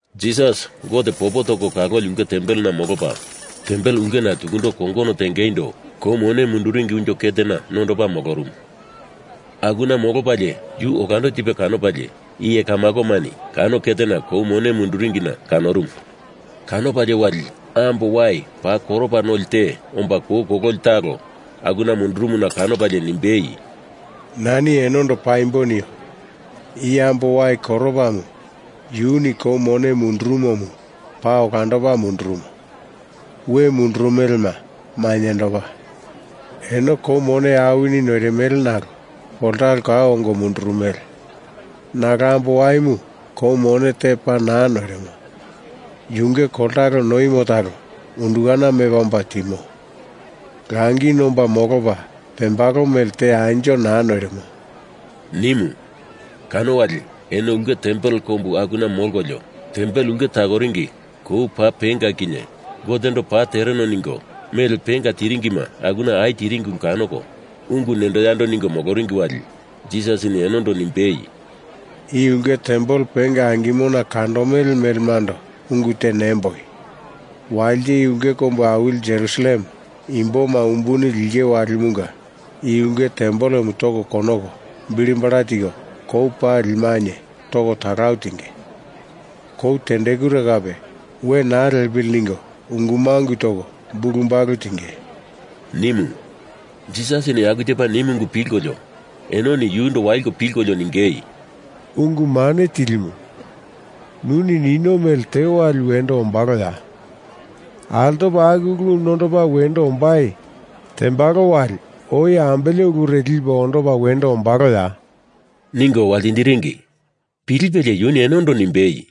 Jisas Gote popo toko kaloli ulke tempelena molopa tempel ulkena tukundo kongono tengeindo kou mone munduringi unjo ketena nondopa molorumu. Akuna molopalie yu olando tipe kanopalie iye kamakomani kano ketena kou mone munduringina kanorumu. Kanopalie wali ambo wai paa koropa noli te omba kou kololi talo akuna mundurumuna kanopalie nimbei, “Nani enondo paimbo nio. I ambo wai koropamu yuni kou mone mundurumomu paa olandopa mundurumo, we mundurumelema mainyendopa. Eno kou mone awini noirimele nalo koltalo kau ongo mundurumele. Nalo ambo waimu kou mone te paa naa noirimo. Yunge koltalo noimo talo undukana mepa omba timo. Langi nomba molopa pembalo mele te anjo naa noirimo,” nimu. Kano wali eno ulke tempel kombu akuna molkolio tempel ulke takoringi kou paa penga kinye Gotendo paa tereno ningo mele penga tiringima akuna au tiringi ulu kanoko, ungu nendo yando ningo moloringi wali Jisasini enondo nimbei, “I ulke tempel penga angimona kandomele melemando ungu te nemboi. Walite i ulke kombu awili Jerusalem imboma umbuni linge walimunga i ulke tempelemu toko konoko bilibala tiko kou pali mainye toko talau tinge. Kou tendekure kape we naa lepili ningo ungu mangu toko bulu balu tinge,” nimu. Jisasini aku tepa nimu ungu pilkolio enoni yundo waliko pilkolio ningei, “Ungu Mane Tilimu, nuni nino mele te wali wendo ombaloya? Altopa aku ulu nondopa wendo ombai tembalo wali oi ambele ulure lipe ondopa wendo ombaloya?” ningo waltindiringi. Pilipelie yuni enondo nimbei,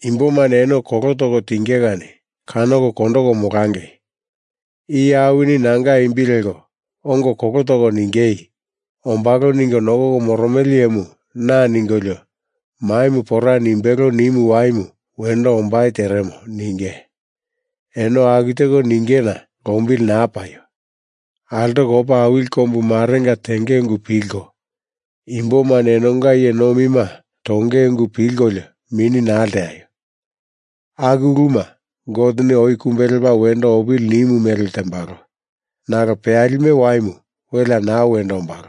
“Imbomani eno kolo toko tinge kani kanoko kondoko molangei! Iye awini nanga imbi leko ongo kolo toko ningei, ‘Ombalo ningo nokoko moromele iyemu na,’ ningolio, ‘Maimu pora nimbelo nimu waimu wendo ombai teremo,’ ninge. Eno aku teko ningena lombili naa paio! Altoko opa awili kombu marenga tenge ungu pilko, imbomani enonga iye nomima tonge ungu pilkolio mini naa lteaio! Aku uluma Goteni oi kumbe lepa wendo opili nimu mele tembalo. Nalo peyalime waimu welea naa wendo ombalo,”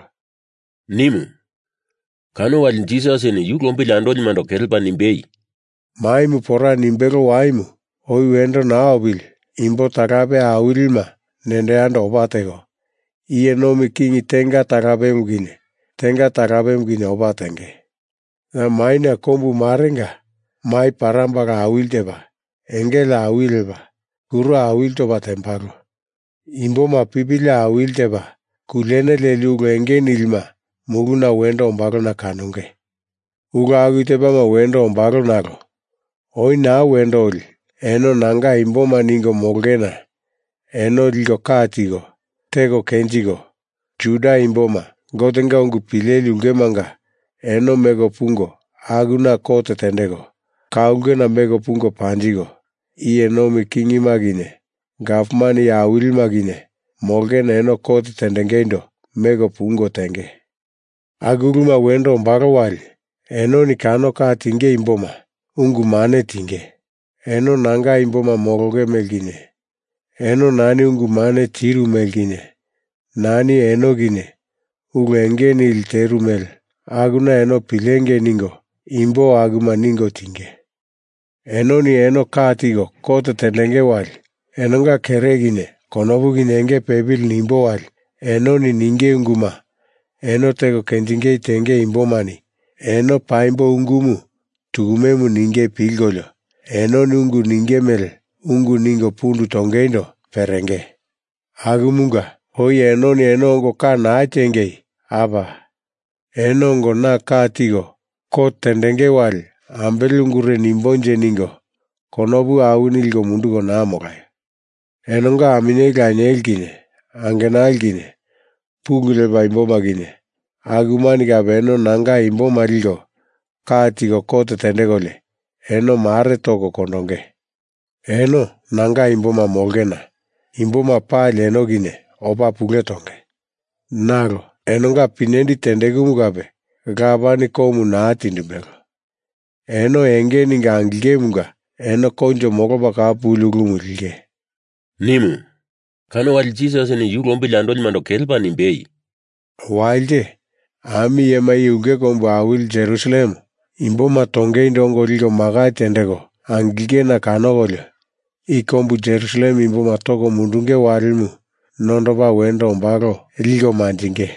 nimu. Kano wali Jisasini yu lombili andolimando kelepa nimbei, “Maimu pora nimbelo waimu oi wendo naa opili imbo talape awilima nendo yando opa teko, iye nomi king tenga talapemu kinye tenga talapemu kinye opa tenge. Ya maina kombu marenga mai parambala awili tepa, engele awili lepa, kuro awili topa tembalo. Imboma pipili awili tepa kuliene leli ulu enge nilima muluna wendo ombalona kanonge. Ulu aku tepama wendo ombalo nalo oi naa wendo oli eno nanga imboma ningo molongena eno liko ka tiko, teko kenjiko, Juda imboma Gotenga ungu pileli ulkemanga eno meko pungo akuna kot tendeko, ka ulkena meko pungo panjiko, iye nomi kingima kinye gavman iye awilima kinye molongena eno kot tendengeindo meko pungo tenge. Aku uluma wendo ombalo wali enoni kano ka tinge imboma ungu mane tinge. Eno nanga imboma molonge mele kinye, eno nani ungu mane tiru mele kinye, nani eno kinye ulu enge nili teru mele akuna eno pilengei ningo, imbo akuma ningo tinge. Enoni eno ka tiko kot tendenge wali, enonga kere kinye konopu kinye enge pepili nimbo wali enoni ninge unguma eno teko kenjingei tenge imbomani eno paimbo ungumu tukumemu ninge pilkolio, enoni ungu ninge mele ungu ningo pundu tongeindo perenge. Akumunga oi enoni eno ongo ka naa tiengei, ‘Apa, eno ongo na ka tiko kot tendenge wali ambele ungure nimbonje?’ ningo konopu awini liko munduko naa molaio! Enonga aminyeli lanieli kinye angenali kinye, pulu lepa imboma kinye, akumani kape eno nanga imboma liko ka tiko kot tendekolio eno mare toko kondonge. Eno nanga imboma molongena imboma pali eno kinye opa pule tonge. Nalo enonga pinyendi tendekumu kape Lapani komu naa tindimbelo. Eno enge ningo angilingemunga eno koinjo molopa kau puli ulumu linge,” nimu. Kano wali Jisasini yu lombili andolimando kelepa nimbei, “Walite, ami iyema i ulke kombu awili Jerusalem imboma tongeindo ongo liko makai tendeko angilingena kanokolio i kombu Jerusalem imboma toko mundunge walimu nondopa wendo ombalo liko manjingei.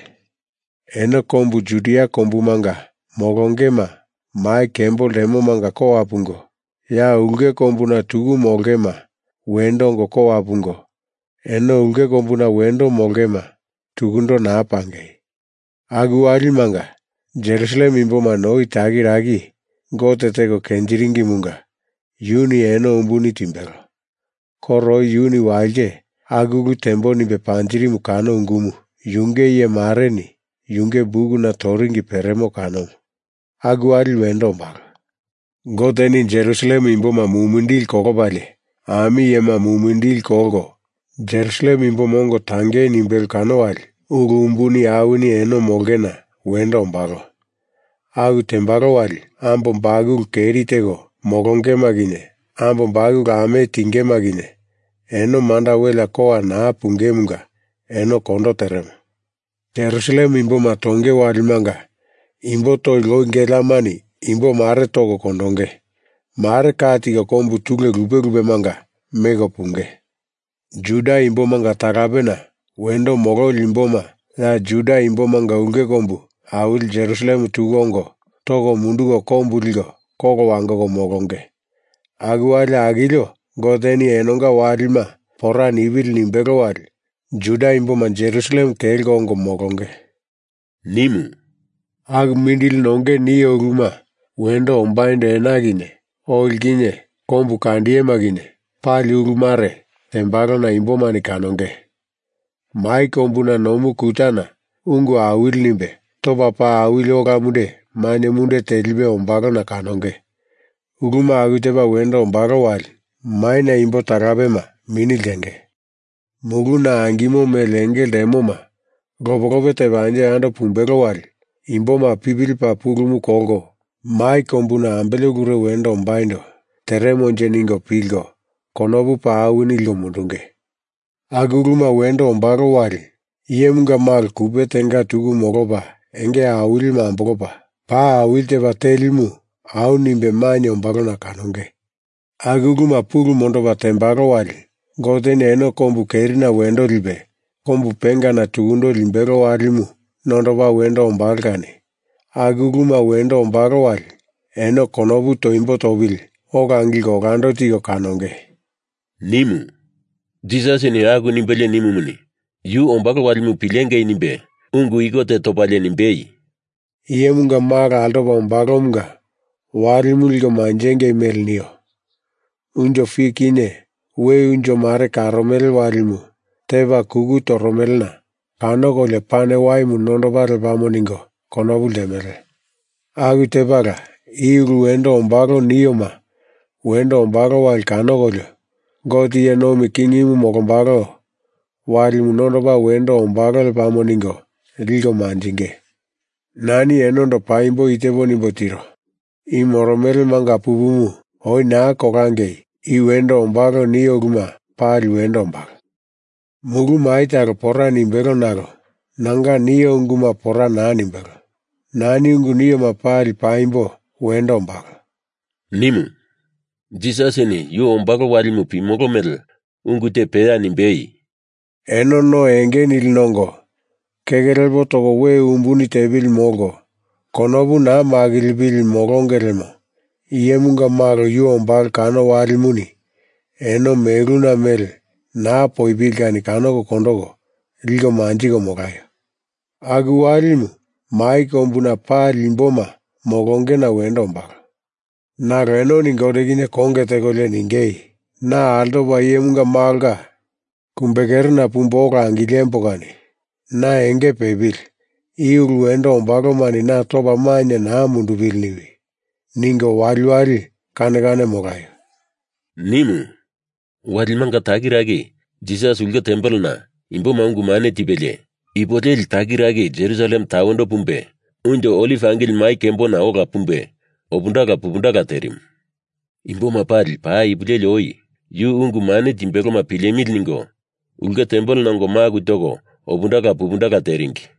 Eno kombu Judia kombumanga molongema mai kembo ltemomanga kowa pungo, ya ulke kombuna tuku molongema wendo ongo kowa pungo, eno ulke kombuna wendo molongema tukundo naa pangei! Aku walimanga Jerusalem imbomani oi takiraki Gote teko kenjiringimunga yuni eno umbuni timbelo. Koro oi yuni walite aku ulu tembo nimbe panjirimu kano ungumu yunge iye mareni yunge bukuna toringi peremo kanomu, aku wali wendo ombalo. Goteni Jerusalem imboma mumindili kolopalie ami iyema mumindili kolko Jerusalem imboma ongo tangei nimbelo kano wali ulu umbuni awini eno molongena wendo ombalo. Aku tembalo wali ambo bakulu keri teko molongema kinye ambo bakulu ame tingema kinye eno manda welea kowa naa pungemunga eno kondo teremo. Jerusalem imboma tonge walimanga imbo toli loi geleamani imbo mare toko kondonge, mare ka tiko kombu tule lupe lupemanga meko punge. Juda imbomanga talapena wendo mololi imboma ya Juda imbomanga ulke kombu awili Jerusalem tuku ongo toko munduko kombu liko kolo wangoko molonge. Aku wali akilio Goteni enonga walima pora nipili nimbelo wali Juda imboma Jerusalem kelko ongo molonge,” nimu. “Aku mindili nonge nio uluma wendo ombaindo ena kinye oli kinye kombukandiyema kinye pali ulumare tembalona imbomani kanonge. Mai kombuna nomu kutana ungu awili nimbe topa paa awili ola munde mainye munde telipe ombalona kanonge. Uluma aku tepa wendo ombalo wali maina imbo talapema mini ltenge. Muluna angimo mele enge ltemoma lope lope tepa anjo yando pumbelo wali imboma pipili paa pulumu kolko mai kombuna ambele ulure wendo ombaindo teremonje ningo pilko konopu paa awini liko mundunge. Aku uluma wendo ombalo wali Iyemunga Malo kupe tenga tuku molopa, enge awilimu ambolopa paa awili tepa telimu au nimbe mainye ombalona kanonge. Aku uluma pulu mondopa tembalo wali Goteni eno kombu kerina wendo lipe kombu pengana tukundo limbelo walimu nondopa wendo ombalo kani aku uluma wendo ombalo wali eno konopu toimbo topili ola angilko olando tiko kanongei,” nimu. Jisasini aku nimbelie nimumuni, yu ombalo walimu pilengei nimbe ungu iko te topalie nimbei, “Iyemunga Malo altopa ombalomunga walimu liko manjingei mele nio. Unjo fik kinye we unjo mare karomele walimu tepa kuku toromelena kanokolio pane waimu nondopa lepamo ningo konopu ltemele. Aku tepala i ulu wendo ombalo nioma wendo ombalo wali kanokolio, Gote iye nomi kingimu molombalo walimu nondopa wendo ombalo lepamo ningo liko manjinge. Nani enondo paimbo i tepo nimbo tiro. I moromele manga pupumu oi naa kolangei i wendo ombalo nio uluma pali wendo ombalo. Mulu mai talo pora nimbelo nalo nanga nio unguma pora naa nimbelo. Nani ungu nioma pali paimbo wendo ombalo,” nimu. Jisasini yu ombalo walimu pimolo mele ungu te peya nimbei, “Eno no enge nili nongo keke lepo toko we umbuni tepili molko konopu naa makilipili molonge lemo Iyemunga Malo yu ombalo kano walimuni eno meluna mele naa poipili kani kanoko kondoko liko manjiko molaio! Aku walimu mai kombuna pali imboma molongena wendo ombalo. Nalo enoni Gote kinye konge tekolio ningei, ‘Na altopa Iyemunga Malonga kumbekerena pumbo ola angilembo kani na enge pepili, i ulu wendo ombalomani na topa mainye naa mundupili niwi,’ ningo waliwali kane kane molaio,” nimu. Walimanga takiraki Jisasini ulke tempelena imboma ungu mane tipelie, ipo leli takiraki Jerusalem tawendo pumbe Unjo Oliv Angili Mai Kembona ola pumbei opundala pupundala terimu. Imboma pali paa ipu leli oi yu ungu mane timbeloma pilemili ningo ulke tempelena ongo maku toko opundala pupundala teringi.